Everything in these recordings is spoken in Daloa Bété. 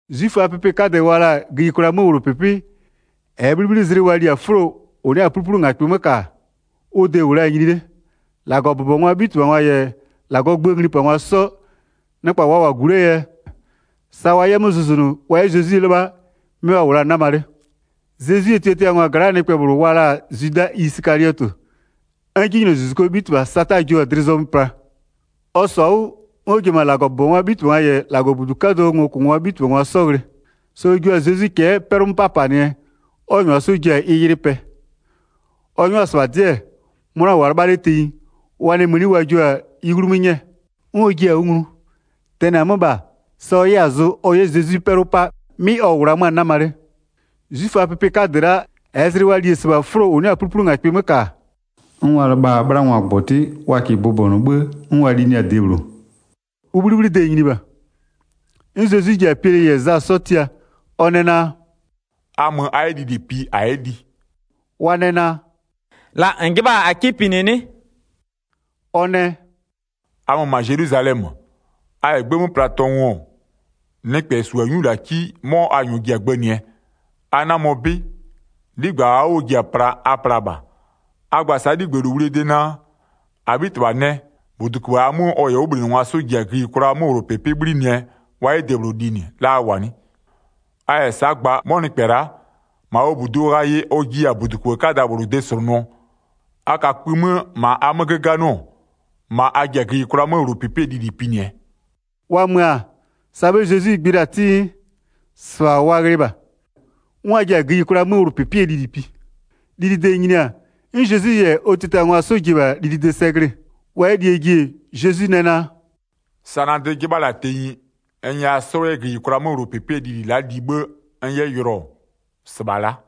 'Zwiföaa pɩpɩ 'kadɛ wa la-a gïyikwlaa 'möwlʋpɩpɩ -ɛɛ 'bhlibhlizlɩ wa li-a 'fʋlo -ʋ 'nɩ-a 'pluplungakpɩ 'mö -ka, ʋ de -wʋ la-a nyini 'le. 2-Lagɔbʋbɔngwaa 'bhitɩbhangwa -yɛ -Lagɔɔ gböö nglipangwa 'sɔ, nɩkpa wa -wʋ-a -gu 'lee yɛ, sa wa 'yɛ 'mö zʋzʋnʋ wa 'yɛ Zezwi 'lɩbha, 'mɩ wa -wʋ la-a 'nama 'le. Zezwie tiatiangwa gla'aa nɩkpɛ -bhlʋ wa la-a Zwida Isɩkaliɔtɩ, 'n 'jinylozuzukuo 'bhitɩbha Sata jio-a dlɩ zɔmö pla. Ɔ -sɔ-a 'wʋ, 'n ɔ ji-e -ma -Lagɔbʋbɔngwaa 'bhitɩbhangwa -yɛ -Lagɔbudu 'kadʋɔ ngokʋngwaa 'bhitɩbhangwa 'sɔ ghlɩ. Sa ɔ jua-a Zezwi cɛ'ɛ 'pɛlʋ 'mö 'papanɩɛ 'n ɔ -nyʋa 'sɔ ji-a ɩ yɩlɩ pɛ. Ɔ 'nyʋa-a -sɩbha 'dɩ-ɛ, 'mʋna-a 'lɩbhʋa-a tenyi, wa nɛ mëni wa jio-a ɩ 'wlumö 'nyɛɛ. 'N ɔ jiɩ-a 'wʋ nglu. Tɛnɩ-a 'mö -bha, sa ɔ 'yɛ-a zʋ ɔ 'yɛ Zezwi 'pɛlʋ 'pa 'mɩ ɔ -wʋ la 'mö-a 'nama 'le. 'Zwiföaa pɩpɩ 'kadɛ la'a -ɛɛ zlɩ wa li-e -sɩbha 'fʋlo -ʋ 'nɩ-a 'pluplungakpɩ 'mö -ka, n wa lɩbha-a 'bhlangɔgbɔtɩ wa -kɩɩ bʋbɔnʋ 'bhë, 'n wa linɩɩ-a debhlʋ, ʋ 'bhlibhlide nyini -bha. 'N Zezwi ji-a Piɛlɩ -yɛ Za 'sɔ tia, ɔ nɛ naa: “A mö a 'yɛ lili pi -a 'yɛ li.” Wa nɛ naa: “La -n 'jɩbha-a -a 'kɩ pinɩ 'nɩ?” Ɔ nɛ: “A mö -ma Zelwizalɛmö, a -yɛ 'gbë 'mö pla tɔngʋ-ɔ, nɩkpɛ -su-a 'nyulaki, 'mɔ a -nyɔɔ 'sɔ ji-a gbënɩɛ, a 'namɔ 'bɩ, 'ligbë -aa 'wʋ ɔ ji-a pla, a pla -bha. A gba sa'a -bha 'ligbëlowlie de naa: -Abhitɩbha nɛ, -buduköbhë -aa 'mö ɔ -yɛ ɔ 'wʋbhlinɩngwa 'sɔ ji-a gïyikwlaa 'möwlʋpɩpɩ 'bhlinɩɛ wa 'yɛ debhlʋ linɩ, la a -wʋ-a 'nɩ? A -yɛ sa'a ɔ de gba, 'mɔ nɩkpɛ la'a -ma ɔ -buduo ghayɩ ɔ jiya-a -buduköbhë 'kada -bhlʋ de -slʋnʋɔ, a ka kpï 'mö -ma a 'mö 'göganɩɔ, -ma a ji-a gïyikwlaa 'möwlʋpɩpɩɛ lili pinɩɛ.” Wa mö-a, sa 'bhë Zezwi gbɩ la-a 'tɩ, -sɩbha wa ghlɩɩ -bha. 'N wa ji-a gïyikwlaa 'möwlʋpɩpɩɛ lili pi. Lilide nyini-a, 'n Zezwi -yɛ ɔ tiatiangwa 'sɔ ji-e -bha linɩde sɛ glɩ-ɩ. Wa 'yɛ lie ji-e, Zezwi nɛ naa: “Sa na dlɩ 'jɩbha la-a tenyi n nyɛya 'sɔ 'yɛ gïyikwlaa 'möwlʋpɩpɩ la'aa lili li 'bhë n 'yɛ yʋlɔ -sɩbha-a la'a.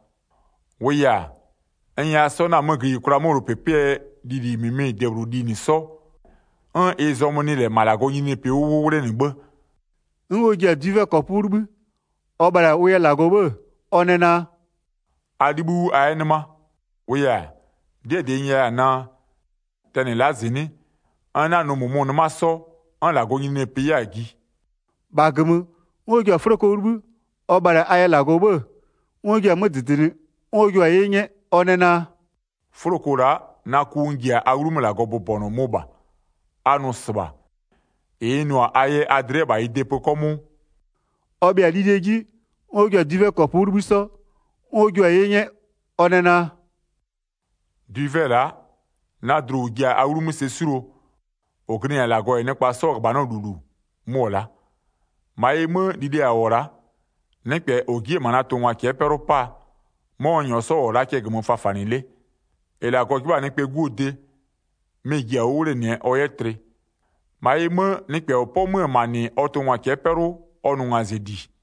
16-Wʋʋ yɛ-a, n nyɛya 'sɔ 'na-a 'mö gïyikwlaa 'möwlʋpɩpɩɛ lili -mɩmɩ debhlʋ linɩ 'sɔ 'n ɩ zɔmö nɩ -lɛ -ma -Lagɔɔ nyininyinipɩ 'wʋ 'wʋ 'wlenɩ 'bhë.” 'N ɔ ji-a dwivɛkɔpʋ 'wʋ 'libhï, ɔ bhalɩ-a ʋ yɛ -Lagɔ 'bhë-ë, ɔ nɛ naa: “A 'libhïʋ 'wʋ a 'yɛ 'nɩma. 18-Wʋʋ yɛ-a, 'dɩɛ -dɩ n nyɛya-a naa: Tɛnɩ la'a -zɩnɩ'ɩ, n 'na nʋ -mʋmʋ 'nɩma 'sɔ 'n -Lagɔɔ nyininyinipɩ 'yɛ-a ji.” 19-Bha -gömö, 'n ɔ ji-a 'fʋloko 'wʋ 'libhï, ɔ bhalɩ-a a yɛ -Lagɔ 'bhë, 'n ɔ jia-a 'mö -dɩdɩnɩ 'n ɔ jua-a 'ye 'nyɛ, ɔ nɛ naa: “'Fʋloko la'a, na ku [n ji-a a 'wlumö -Lagɔ bʋbɔnʋɔ, mʋ -bha. A nʋ -sɩbha, -ɩ n nʋ-a a yɛ a dlɩ 'yɛ -bha ɩ de pö 'kɔmʋʋ.” Wa bhɩa-a lilie 'ji, 'n ɔ ji-a dwivɛkɔpʋ 'wʋ 'libhï 'sɔ, 'n ɔ jua-a 'ye 'nyɛ, ɔ nɛ naa: “Dwivɛ-ɛ la'a, na dlu -ʋ ji-a a 'wlumö sɛ 'suluo, -ʋ glɩnɩ-a -Lagɔ -yɛ nɩkpa 'sɔɔ -ghöbhanɔ -lulu, mʋ-ɔ la'a.] 21-Ma ɩ 'mö, li le -a -wʋ-ɔ la'a, nɩkpɛ -ɔ ji'i-e -ma na tʋngwa cɛ'ɛ 'pɛlʋ 'paa, 'mɔ n -nyɔɔ -wʋ-ɔ la'a cɛ -gömö fafanɩ 'le. 22-Ɩ -Lagɔ 'jɩbha-a Nɩkpɛɛ 'Guo de, mɩ-ɩ ji-a 'wʋ 'wlenɩɛ ɔ 'yɛ tlɩ. -Ma ɩ 'mö, nɩkpɛ -ɔ 'pɔ 'mö-ö -ma -nɩ ɔ tʋngwa cɛ'ɛ 'pɛlʋ, ɔ nʋ ngazɩli.”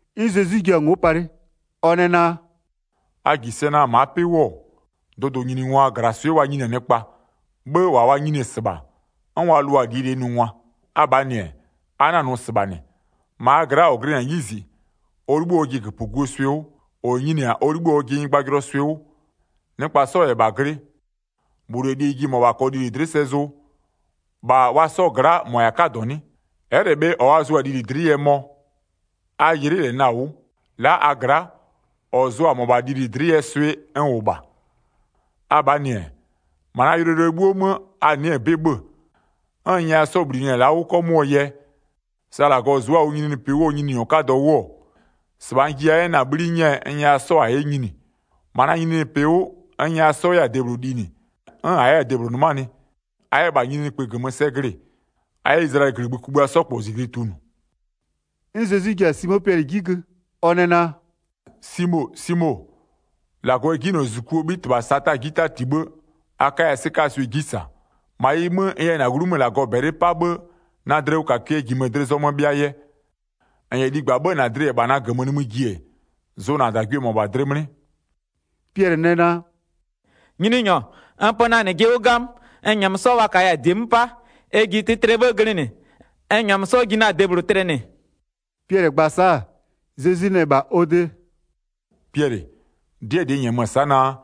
'N Zezwi jua-a ngo'o palɩ, ɔ nɛ naa: “A -ji sɛ naa, ma'a 'pɩ 'wʋ-ɔ, dʋdʋnyiningwa -glaswɩ'ɩ wa nyini-a nɩkpa, 'bhë -wa wa nyini-e -sɩbha, 'n wa lʋa-a -lie -lie nʋngwa. Abhaa -nɩ-ɛ, a 'na-a nʋ -sɩbha -nɩ. -Ma a gla'a -ɔ glɩnɩ-a 'yizi, ɔ 'libhï ɔjɩ -göpöguo swɩ 'wʋ, -ɔ nyini-a ɔ 'libhï ɔjɩ nyɩgbajʋlʋɔ swɩ 'wʋ. Nɩkpa 'sɔ -yɛ -bha glɩ, -bhlʋ -yɛ lie ji -mɔbha -kɔɔ lili dlɩ'ɩ sɛ zʋ, -bha wa 'sɔɔ gla'a -mɔ -yɛ-a 'kadɔ 'nɩ? Ɛ'ɛ -lɛ bhe -ɔ wa zʋ-a lili dlɩ'ɩ yɛ mɔ? A -yɩlɩ'ɩ -lɛ na-a 'wʋ, la'a a gla'a, ɔ zʋ-a -mɔbha lili dlɩ'ɩ yɛɛ swɩ n -wʋ -bha. Abhaa -nɩ-ɛ, -ma na yʋlɔyʋlʋɛ 'bhuo 'mö a nɩ'ɩ-ɛ 'bɩ 'bhö-ö, 'n n nyɛya 'sɔ -bhlinɩ-a 'wʋ 'kɔmʋʋɔ yɛ, sa -Lagɔ zʋ'ʋ-a ʋ nyininyinipɩ 'wʋɔ Nyininyɔ 'kadɔ 'wʋ-ɔ, -sɩbha n jiya 'yɛ na-a 'bhli 'nyɛ-ɛ n nyɛya 'sɔ -a 'yɛ nyini. 30-Ma na nyininyinipɩ 'wʋ, n nyɛya 'sɔ -a 'yɛ-a debhlʋ linɩ, 'n -a 'yɛ-a debhlʋ 'nɩmanɩ, a 'yɛ-ɛ -bha nyininyinikpï -gömö sɛ glɩ-ɩ, a 'yɛ Izlayɛlɩɛ -gligbï kugbïa 'sɔ -kpɔ -zijli tunʋ.” 'N Zezwi ji-a Simo Piɛlɩ 'ji gö, ɔ nɛ naa: “Simo, Simo -Lagɔ yɛ 'jinylozuzukuo 'bhitɩbha Sata 'ji 'tati 'bhë, a 'kaya 'sɩkaa swɩ 'ji -sa. 32-Ma ɩ 'mö, n yɛ -na 'wlumö -Lagɔ -bɛlɩ 'pa 'bhë na dlɩwʋkakɩɛ -jimö-ö dlɩ zɔmö bhɩaa yɛ. -N -yɛ ligba, 'bhë -na dlɩ -yɛ -bha na -gömö nimï ji-e, zʋ -na -dagwie -mʋabha dlɩ 'mlɩ.” Piɛlɩ nɛ naa: “Nyininyɔ, n pö na -nɩ jɩ 'wʋ 'gamö, n -nyɛmö 'sɔ wa -kaya-a -die 'mö 'pa, ɛ ji tlɩtlɩɛ 'bhë glɩnɩ, n -nyɛmö 'sɔ ji na-a debhlʋ tlɩnɩ.” Piɛlɩ gba-a sa'a, Zezwi nɛ -bha ɔ de: “Piɛlɩ, 'dɩɛ -dɩ n -nyɛmö-ö sa'a naa,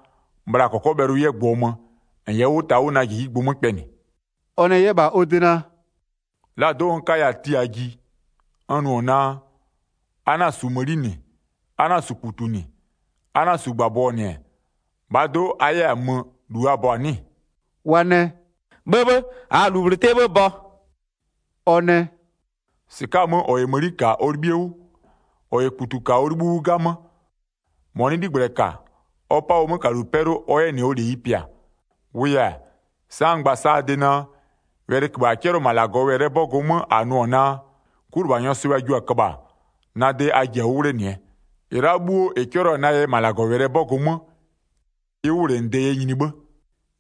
bhla -kɔkɔbhɛlʋ 'yɛ gbʋɔ mö, -n yɛ 'wʋ ta na -jijigbʋ 'mö kpɛnɩ.” Ɔ nɛ 'yɛ -bha wa de naa: “La do'o n 'kaya-a la'a tiaa ji, n nʋ-ɔ naa: A 'na-a -su mëni -nɩ, a 'na-a -su -kputu -nɩ, a 'na-a -su -gbabɔ -nɩ-ɛ, -bhaa do'o a 'yɛ-a mö -lu a bɔ-a 'nɩ-ɩ?” Wa nɛ: “'Bhëbhë, -aa-a -lu -bhlʋ 'tɩɛ 'bhë bɔ.” Ɔ nɛ: “-Sɩka'a-a 'mö, -ɔ -yɛ mëni -ka ɔ 'libhie 'wʋ, -ɔ -yɛ -kputu -ka, ɔ 'libhïʋ 'wʋ 'gamö. -Mɔ nɩ 'ligblɛ -ka, ɔ 'pa ɔ 'mökalu 'pɛlʋ ɔ 'yɛ -nɩ ɔ -leyi pɩa. 37-Wʋʋ yɛ-a, sa'a n gba-a sa'a a de naa: Wɛlɩköbhë -a 'cɛlɩɔ-ɔ -ma -Lagɔwɛlɩɛ 'bɔgʋ 'mö -a nʋ-ɔ naa: 'Kulɩbhanyɔɔ swɩ'ɩ wa jio-a köbha-a, na de a ji-a 'wʋ 'wlenɩɛ. -Ɩ la'a 'bhuo -ɩ 'cɛlɩɔ-a na yɛ -ma -Lagɔwɛlɩɛ 'bɔgʋ 'mö, ɩ 'wʋwlenɩde yɛ 'yɛ nyini 'bhë.”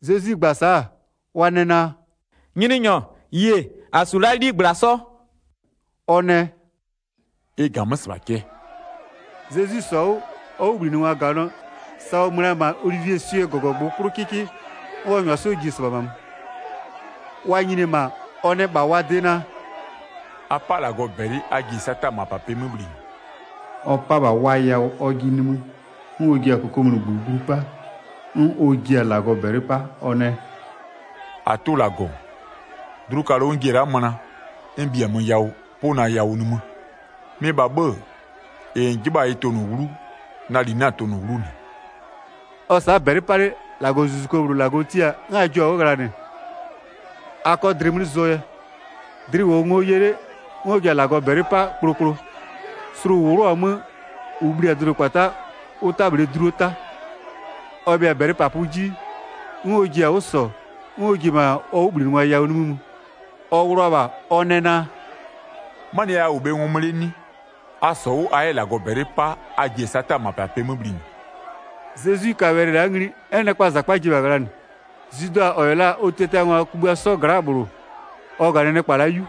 Zezwi gba-a sa'a, wa nɛ naa: “Nyininyɔ, yie, -a -su la'a 'ligbla 'sɔ.” Ɔ nɛ: “Ɩ -ga-a 'mö -sɩbha cɛ.” Zezwi -sɔ-a 'wʋ, ɔ 'wʋbhlinɩngwa -ganɩɔ, sa ɔ mö la-a -ma Olivieswie -gɔgɔgbʋ 'klʋ 'kɩkɩ, 'n ɔ -nyʋa 'sɔ ji-e -sɩbha -ma mö. Wa nyini-e -ma, ɔ nɛ -bha wa de naa: “A 'pa -Lagɔ -bɛlɩ a ji-e Sataa -mapapɩɛ 'mö bhlinɩ.” Ɔ 'pa-a -bha wa yawʋ ɔjɩ nimï, 'n ɔ ji-a -kokomunigbö glu 'pa, 'n ɔ ji-a -Lagɔ -bɛlɩ 'pa. Ɔ nɛ: “-Atʋ -Lagɔ, dlukalʋ n ji-e la'a möna, n -bhiamö yawʋ, 'pʋ -bha na yawʋ nimï, mɩ -bha 'bhë-ë, -ɩ -n 'jɩbha-a ɩ tʋnʋ 'wlu, na -li 'na-a tʋnʋ 'wlu -nɩ.” [ Ɔ-ɔ sa'a -bɛlɩ 'pa 'le, -Lagɔzuzuko -bhlʋ -Lagɔ tia-a 'n a jio-a 'wʋ ghlanɩ a 'kɔ dlɩ 'mlɩ zʋɔ yɛ. Dlɩ -wʋɔ ngo ye 'le 'n ɔ ji-a -Lagɔ -bɛlɩ 'pa kplokplo, slʋ -ʋ 'wlʋɔ-a 'mö -ʋ bhli-a dʋdʋkpata'a, ʋ 'ta -bhlee dluo 'ta.] Ɔ bhɩa-a -bɛlɩpapʋ 'ji, 'n ɔ ji-a 'wʋ -sɔ, 'n ɔ ji-e -ma ɔ 'wʋbhlinɩngwa yawʋ nimï mö. Ɔ ghlʋa-a -bha, ɔ nɛ naa: “'Manɩɛ yɛ a -wʋ bhe ngɔmö 'le 'nɩ? A -sɔ 'wʋ, a 'yɛ -Lagɔ -bɛlɩ 'pa, a ji-e Sataa -mapapɩɛ 'mö -bhlinɩ.” Zezwi ka wɛlɩ la'a ngli, 'n nɩkpaa -zakpa ji-e -bha ghlanɩ. Zwida, -ɔ -yɛ la-a ɔ tiatiangwa kugbïa 'sɔ gla'aa -bhlʋ, ɔ -ganɩ nɩkpa la'a 'yu.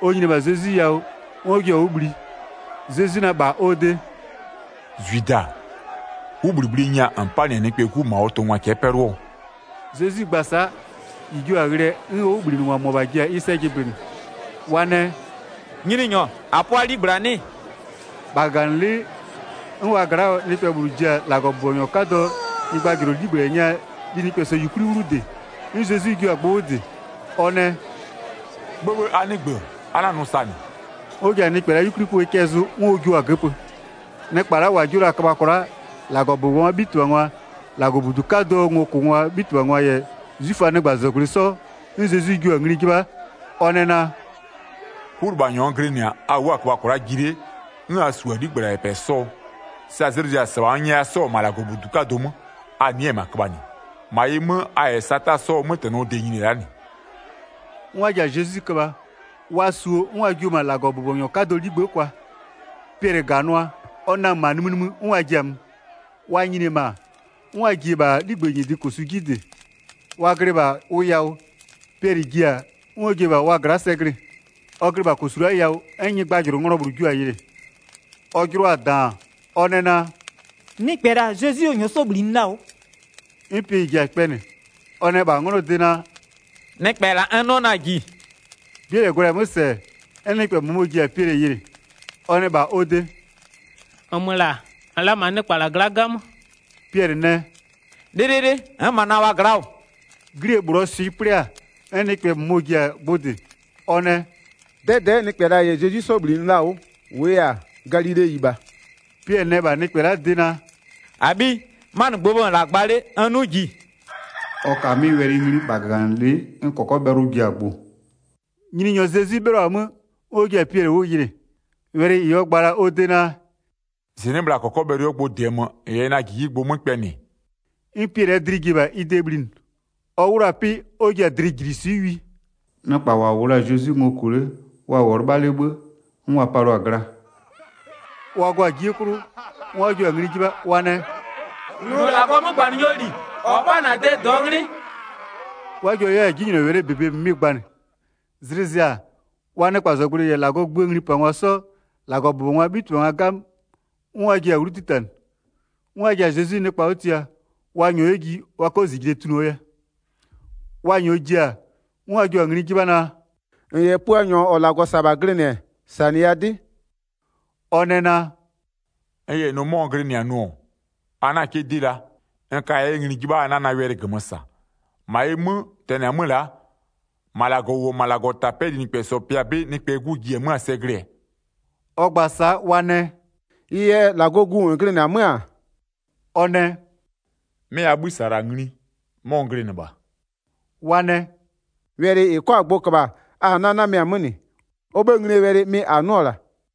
Ɔ nyini-e -bha Zezwi yawʋ, 'n ɔ jio-a 'wʋ bhli. Zezwi nɛ -bha ɔ de: “Zwida, 'wʋbhlibhlie nya -n 'panɩ-a Nɩkpɛɛ 'Gu -ma ɔ tʋngwa cɛ'ɛ 'pɛlʋɔ?” Zezwi gba-a sa'a, -ɩ jio-a ghlɩɛ 'n ɔ 'wʋbhlinɩngwa -mʋabha ji-a ɩ sɛ jɩblɩnɩ. Wa nɛ: “Nyininyɔ, -a 'pʋa 'ligbla 'nɩ-ɩ?” 50-Bha -gaganɩlɩ'ɩ, 'n wa gla'aa nɩkpɛ -bhlʋ ji-a -Lagɔbʋbɔnyɔ 'kadɔɔ nyɩgbajʋlʋ 'ligblɛ nya linɩkpɛsɔ -yukwli 'wlu -dɩ. 'N Zezwi jua-a gbʋ 'wʋ -dɩ, ɔ nɛ: “'Bhëbhë, a 'nɩgbö, a 'na-a nʋ -sa -nɩ.” 'N ɔ ji-a nɩkpɛ la'aa 'yukwliköbhë cɛ zʋ 'n ɔ jio-a göpö. Nɩkpa -wa jio la-a köbha kwla'a, -Lagɔbʋbɔngwaa 'bhitɩbhangwa-a, -Lagɔbudu 'kadʋɔ ngokʋngwaa 'bhitɩbhangwa -yɛ 'zwiföaa nɩkpazɔgblʋɩ 'sɔ, 'n Zezwi jua-a ngli 'jɩbha, ɔ nɛ naa: “'Kulɩbhanyɔ n glɩnɩ-a, a wʋ'ʋ-a köbha kwla'a ji 'le, 'n a -su-a 'ligbla -yɛ -pɛ 'sɔɔ? Sa zlɩ zɩ-a, -sɩbha n nyɛya 'sɔ -wʋ-ɔ -ma -Lagɔbudu 'kadʋ 'mö, a nɩ'ɩ-ɛ -ma köbhanɩ. -Ma ɩ 'mö, a -yɛ Sataa 'mötɛnɔ 'sɔɔ de-e nyini-e la'a -nɩ.” 'N wa ji-a Zezwi köbha, wa -suo 'n wa jio-o -ma -Lagɔbʋbɔnyɔ 'kadɔɔ 'ligbë'ë kwa. Piɛlɩ -ganʋa, ɔ namö -ma nimï nimï 'n wa ji-a mö. Wa nyini-e -ma, 'n wa ji-e -bha 'ligbë -nyɩdɩ -kosu 'ji -dɩ. Wa glɩ -bha ʋ yawʋ, Piɛlɩ ji-a, 'n ɔ ji-e -bha wa gla'a sɛ glɩ-ɩ. Ɔ glɩ -bha -kosu la'aa yawʋ 'n nyɩgbajʋlʋnglɔ -bhlʋ jio-a yɩlɩ. Ɔ jɩlɔ-a -daan, ɔ nɛ naa: “Nɩkpɛ -la, Zezwi ɔ -nyɔɔ 'sɔ -bhlinɩ la-a 'wʋ.” 'N Piɛlɩ ji-a kpɛnɩ, ɔ nɛ -bha 'nglɔɔ de naa: “Nɩkpɛ -la n 'nɩɔ 'na-a -ji.” 'Bie -lɛ gwlɛ-a 'mö -sɛ, 'n nɩkpɛ -mʋmɔ ji-a Piɛlɩ yɩlɩ. Ɔ nɛ -bha ɔ de: “-Nmö -la, -n-n la -ma -na nɩkpa -la gla'a 'gamö.” Piɛlɩ nɛ: “'Lɩlɩlɩ, n'n -ma na-a wa gla'a -wʋ.” 'Glie -bhlʋɔ swɩ 'plɩ-a, 'n nɩkpɛ -mʋmɔ ji-a gbʋ -dɩ, ɔ nɛ: “'Dɛdɛ'ɛ nɩkpɛ -la -yɛ Zezwi 'sɔ -bhlinɩ la-a 'wʋ. -Wʋʋ yɛ-a, Galileyi -bha.” Piɛlɩ nɛ -bha nɩkpɛ la'aa de naa: “-Abhiyi, 'manɩgbʋɔ 'bhë -n -wʋ -la gba 'le, n 'nʋ -ji.” Ɔ ka 'mɩ wɛlɩ ngli, -bha -gaganɩlɩ'ɩ 'n -kɔkɔbhɛlʋ ji-a gbʋ. Nyininyɔ Zezwi 'bhɩlɔ-a 'mö, 'n ɔ ji-a Piɛlɩ 'wʋ yɩlɩ. Wɛlɩ -ɩ ɔ gba la-a ɔ de naa: “-Zɩnɩ'ɩ, bhla -kɔkɔbhɛlʋ 'yɛ gbʋɔ mö, -n yɛ 'wʋ ta na -jijigbʋ 'mö kpɛnɩ-ɛ,” 'n Piɛlɩɛ dlɩ ji-e -bha ɩ de bhlinɩ. Ɔ 'wlʋɔ-a 'pɩ, 'n ɔ ji-a dlɩjiliswɩ'ɩ wi. Nɩkpa -wa -wʋ la-a Zezwi ngo -kʋ 'le, wa -wʋɔ 'lɩbha 'le 'bhë, 'n wa palɩɔ-a gla. Wa gɔ-a 'jie 'klʋ, 'n wa jio-a ngli 'jɩbha, wa nɛ: “Nʋ -Lagɔɔ 'mögbanɩnyɔɔ -li, -ɔ 'pa-a -na de -dɩɔ 'nglɩ.” 'N wa jio 'yɛ-a 'jinylɔwɛlɩɛ -bebe -mɩmɩ gbanɩ. Zlɩ zɩ-a, wa nɩkpazɔgblʋɩ -yɛ -Lagɔɔ gböö nglipangwa 'sɔ, -Lagɔbʋbɔngwaa 'bhitɩbhangwa 'gamö, 'n wa ji-a 'wlu 'titanɩ, 'n wa ji-a Zezwi nɩkpa 'wʋ tia, wa -nyɔɔ 'yɛ ji, wa 'kɔ -zijle tunʋɔ yɛ. Wa -nyɔɔ ji-a, 'n wa jio-a ngli 'jɩbha naa: “-N -yɛ Puanyɔ -ɔ -Lagɔ -sa-a -bha glɩnɩ-ɛ, -sanɩya 'dɩ.” Ɔ nɛ naa: “N -yɛ nʋ 'mɔ n glɩnɩ-a nʋ-ɔ, a 'na 'kɩ 'dɩ la. N kaya 'yɛ ngli 'jɩbha, a 'na na wɛlɩ -gömö -sa. 69-Ma ɩ 'mö, tɛnɩ-a 'mö la'a, -ma -Lagɔ -ʋ -wʋ-ɔ -ma -Lagɔtapɛ'ɛɛ linɩkpɛsɔ pɩa 'bɩ Nɩkpɛɛ 'Gu ji-e 'mö-a sɛ glɩɛ.” Ɔ gba-a sa'a wa nɛ: “Ɩ yɛ -Lagɔɔ Gu -n glɩnɩ-ɛ 'mö-a?” Ɔ nɛ: “'Mɩ a 'bhï -sa-a -la ngli, 'mɔ n glɩnɩ -bha.” Wa nɛ: “Wɛlɩ -ɩ 'kɔ-a gbʋ köbha-a a-a 'na-a yɩlɩɩ-a 'mö yɛ -nɩ. Ɔ 'bhëë nglie wɛlɩ 'mɩ -a 'nʋ-ɔ -la.”